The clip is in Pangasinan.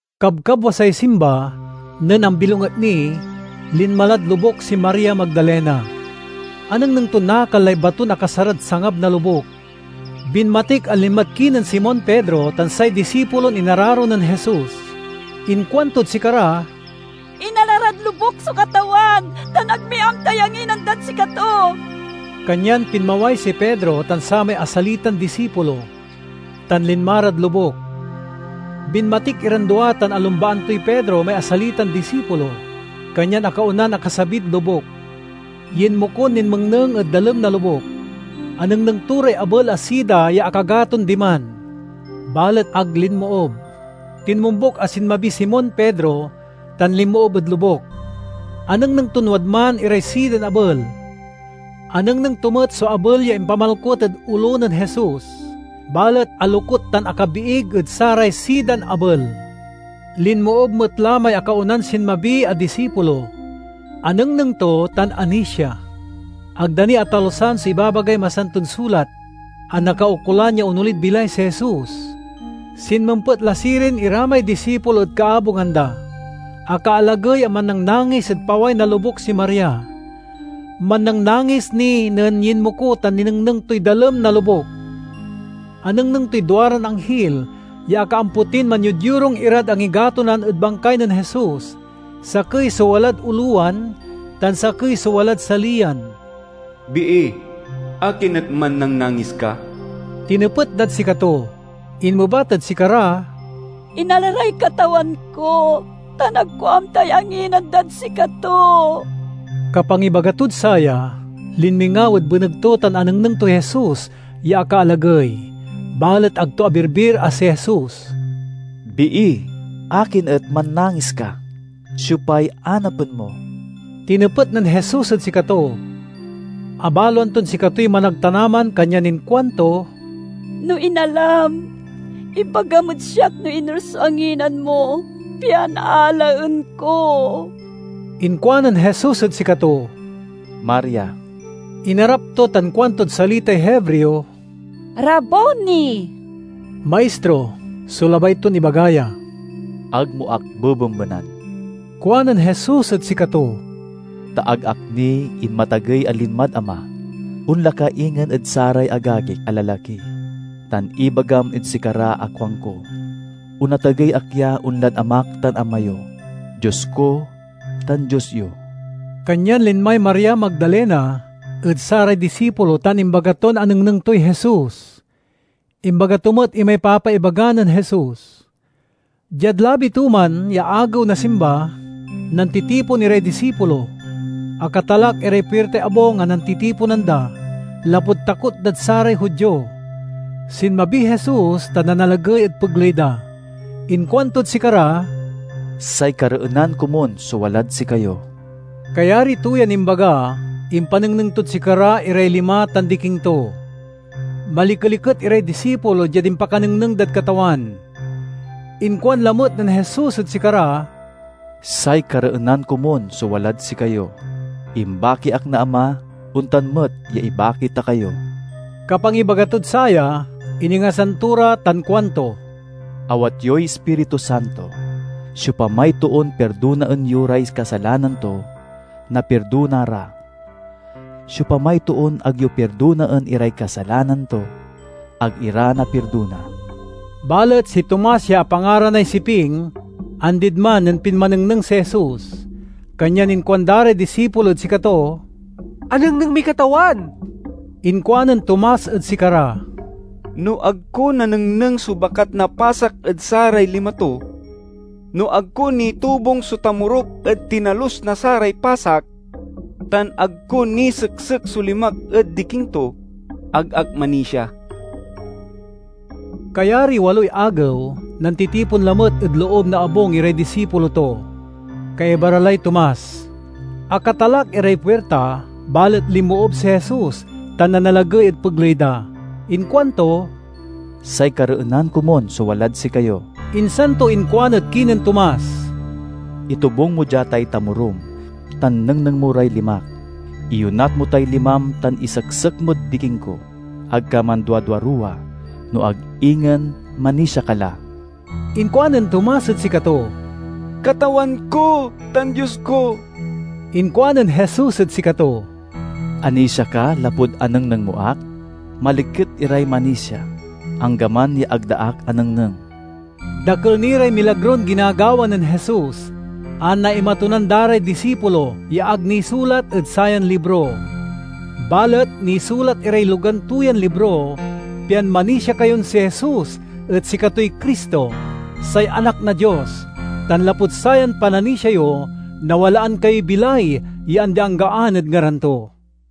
Kabkabwasay Simba, nen ambilonget ni, linma lad lobuk si Maria Magdalena. Anengneng ton nakal lay baton akasarad sangab na lobuk. Binmatik a linmad kinen Simon Pedro tan say disipulon inararo nen Jesus. Inkuantod sikara, "Inala rad lobuk so Katawan, tan ag mi amtay anginan dad sikato!" Kanyan pinmaway si Pedro tan samay asalitan disipulo, tan linma rad lobuk. Binmatik iran dua tan alumbaan toy Pedro may asalitan disipulo, kanyan akaonan akasabid lobuk. Yinmokon ninmengneng ed dalem na lobuk. Anengneng to ray abel a sida ya akagaton diman, balet ag linmoob. Tinmombuk a sinmabiy Simon Pedro tan linmoob ed lobuk. Anengneng ton wadman iray sidan abel. Anengneng to met so abel ya impamalkut ed olo nen Jesus, balet alokut tan akabiig ed saray sidan abel. Linmoob met la may akaonan sinmabi a disipulo; anengneng to tan anisia. (Ag da ni atalusan so ibabagay Masanton Sulat a nakaukolan ya onolid bilay si Jesus.) Sinmempet la sirin ira may disipulo ed kaabungan da. Akaalagey a mannangnangis ed paway na lobuk si Maria. Mannangnangis ni nen yinmoko tan ninengneng toy dalem na lobuk. Anengneng toy duaran anghil ya akaampotin manyodyorung irad angigatonan ed bangkay nen Jesus, sakey so walad olowan tan sakey so walad saliyan. "Bii, akin et mannangnangis ka?" tinepet dad sikato. Inmebat ed sikara, "Inala ray Katawan ko tan ag ko amtay anginan dad sikato!" Kapangibaga tod saya, linmingaw ed beneg to tan anengneng toy Jesus ya akaalagey, balet ag to abirbir a si Jesus. "Bii, akin et mannangis ka? Siopay anapen mo?" tinepet nen Jesus ed sikato. Abaloan ton sikatoy managtanaman kanyan inkuanto, "No inalam, ibagam ed siak no iner so anginan mo, pian alaen ko." Inkuanen Jesus ed sikato, "Maria!" Inarap to tan kuantod salitay Hebreo, "Raboni!" ("Maistro" so labay ton ibaga ya.) "Ag mo ak bebembenan," kuanen Jesus ed sikato, "ta ag ak ni inmatagey a linmad Ama. Onla ka ingen ed saray agagik a lalaki tan ibagam ed sikara a kuanko, 'Onatagey ak ya onlad Amak tan Ama yo, Dios ko tan Dios yo.'" Kanyan linmay Maria Magdalena ed saray disipulo tan imbaga ton anengneng toy Jesus. Imbaga to met imay papaibaga nen Jesus. Diad labi to man ya agew na Simba, nantitipon iray disipulo. Akatalak iray puirtay abung a nantitiponan da, lapud takot dad saray Judio. Sinmabiy Jesus tan nanalagey ed pegley da. Inkuantod sikara, "Say kareenan komun so walad sikayo!" Kayari to yan imbaga, impanengneng tod sikara iray lima tan diking to. Malikeliket iray disipulo diad impakanengneng dad Katawan. Inkuan lamet nen Jesus ed sikara, "Say kareenan komun so walad sikayo! Imbaki ak na Ama, ontan met ya ibaki ta kayo." Kapangibaga tod saya, iningasan to ra tan kuanto, "Awat yoy Ispiritu Santo. Siopamay toon pirdonaen yo ray kasalanan to, napirdona ra; siopamay toon ag yo pirdonaen iray kasalanan to, ag ira napirdona." Balet si Tomas ya apangaranay Siping, andid man nen pinmanengneng si Jesus. Kanyan inkuanda ray disipulo ed sikato, "Anengneng miy Katawan!" Inkuanen Tomas ed sikara, "No ag ko nanengneng so bakat na pasak ed saray lima to, no ag ko nitobung so tamorok ed tinalus na saray pasak, tan ag ko niseksek so limak ed diking to, ag ak manisia." Kayariy waloy agew, nantitipon lamet ed loob na abung iray disipulo to. Kaiba ra lay Tomas. Akatalak iray puirta, balet linmoob si Jesus tan nanalagey ed pegley da. Inkuanto, "Say kareenan komun so walad sikayo!" Insan to inkuan ed kinen Tomas, "Itobung mo dia tay tamorom tan nengneng mo ray limak. Iyonat mo tay limam tan iseksek mod diking ko. Ag ka manduaduaruwa, no ag ingen manisia ka la!" Inkuanen Tomas ed sikato, "Katawan ko tan Dios ko!" Inkuanen Jesus ed sikato, "Anisia ka lapud anengneng mo ak? Maliket iray manisia, anggaman ya ag da ak anengneng!" Dakel ni ray milagron ginagawa nen Jesus, a naimatonan da ray disipulo, ya ag nisulat ed sayan libro. Balet nisulat iray logan to yan libro, pian manisia kayon si Jesus et sikatoy Cristo, say Anak na Dios, tan lapud sayan pananisia yo, nawalaan kayoy bilay ya andi-anggaan ed ngaran to.